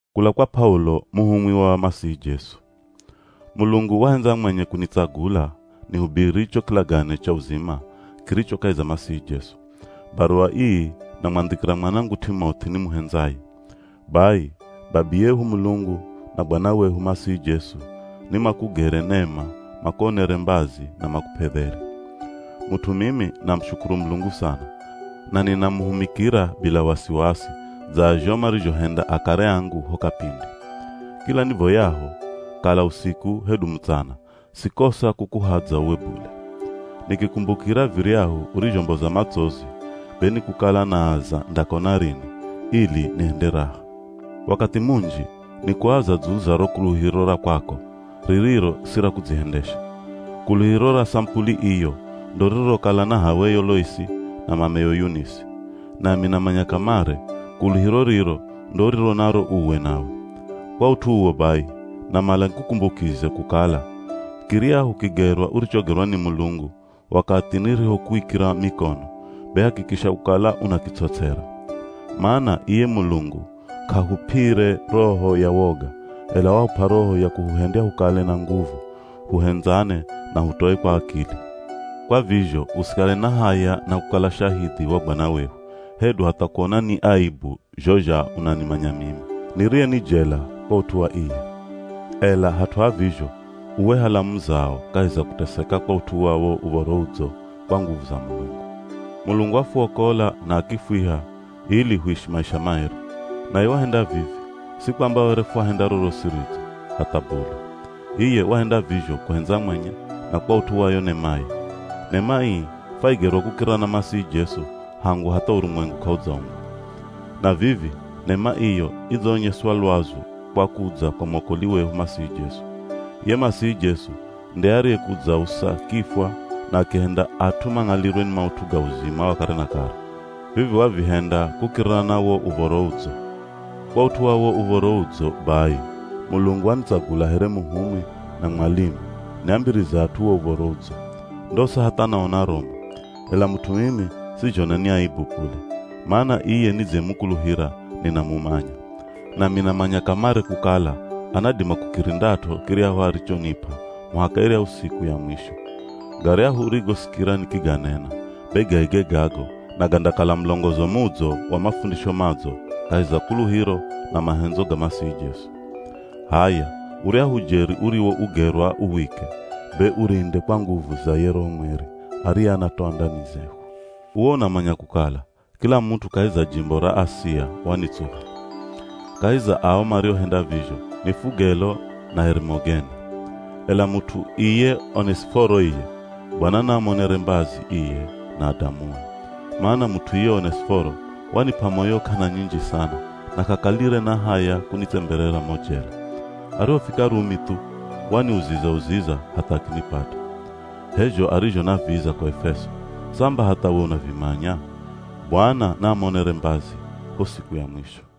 Kula kwa P'aulo muhumwi wa Masihi Jesu. Mulungu wahendza mwenye kunitsagula nihubiri cho kilagane cha uzima kiricho kahi za Masihi Jesu. Baruwa ii namwandhikira mwanangu T'imoth'i nimuhendzaye. Bai babiyehu Mulungu na Bwana wehu Masihi Jesu nimakugere nema makuonere mbazi na makup'e dheri. Mut'u mimi namushukuru Mulungu sana, na ninamuhumikira bila wasiwasi dza zho marizhohenda akare angu ho kapindi. Kila nivoyaho, kala usiku hedu mutsana sikosa kukuhadza uwe bule. Nikikumbukira viryahu urizhomboza matsozi, be nikukala naaza ndakona rini, ili nihende raha. Wakathi munji, nikuaza dzulu za ro kuluhiro ra kwako, ririro si ra kudzihendesha. Kuluhiro ra samupuli iyo, ndo ririrokala na h'aweyo Loisi, na mameyo Yunisi. Nami namanya kamare, kuluhiro riro ndo uriro naro uwe nawe. Kwa ut'u uwo bai, namala nikukumbukize kukala, kiryahu kigerwa urichogerwa ni Mulungu, wakathi nirihokuikira mikono, be hakikisha kukala unakits'ots'era. Mana iye Mulungu k'ahup'ire roho ya woga, ela wahup'a roho ya kuhuhendya hukale na nguvu, huhendzane na hutoe kwa akili. Kwa vizho usikale na haya na kukala shahidhi wa Bwana wehu, hedu hatha kuona ni aebu zho zha unanimanya mimi, niriye ni jela kwa ut'u wa iye. Ela hat'u ha vizho uwe hala muzao kahi za kuteseka kwa ut'u wa wo Uv̱oro Udzo kwa nguvu za Mulungu. Mulungu wafuokola na akifwiha, ili huishi maisha maeri. Naye wahenda vivi, si kwamba were fwahenda rorosi ridzo, hatha bule. Iye wahenda vizho kuhendza mwenye na kwa ut'u wa yo nemaye. Nema ii fwaigerwa kukirira na Masihi Jesu hangu hatha urumwengu k'audzaumbwa. Na vivi nema iyo idzaonyeswa lwazu kwa kudza kwa mwokoli wehu Masihi Jesu. Iye Masihi Jesu nde ariyekudzausa kifwa na akihenda at'u mang'alirwe ni maut'u ga uzima wa kare na kare. Vivi wavihenda kukirira na wo Uv̱oro Udzo. Kwa ut'u wa wo Uv̱oro Udzo bai Mulungu wanitsagula here muhumwi na mwalimu niambirize at'u wo Uv̱oro Udzo. Ndosa hatha naona romu. Ela mut'u mimi sizhona ni aebu bule, mana iye nidziyemukuluhira ninamumanya. Nami namanya kamare kukala anadima kukirindat'o kiryahu arichonip'a muhaka iryahu siku ya mwisho. Garyahu urigosikira nikiganena, be gaige gago na gandakala mulongozo mudzo wa mafundisho madzo kahi za kuluhiro na mahendzo ga Masihi Jesu. H'aya uryahu ujeri uriwougerwa uwike, be urinde kwa nguvu za ye Roho Mweri ariye anatoa ndani zehu. Uwe unamanya kukala kila mut'u kahi za jimbo ra Asia wanitsuha. Kahi za ao mariohenda vizho ni Fugelo na Herimogene. Ela mut'u iye Onesiforo iye, Bwana naamuonere mbazi iye na adamue. Mana mut'u iye Onesiforo, wanip'a moyo k'ana nyinji sana na k'akalire na haya kunitsemberera mo jela. Arihofika Rumi thu, waniuziza-uziza hatha akinipata. H'e zho arizhonaviza ko Efeso, samba hatha we unavimanya. Bwana naamuonere mbazi, ho siku ya mwisho.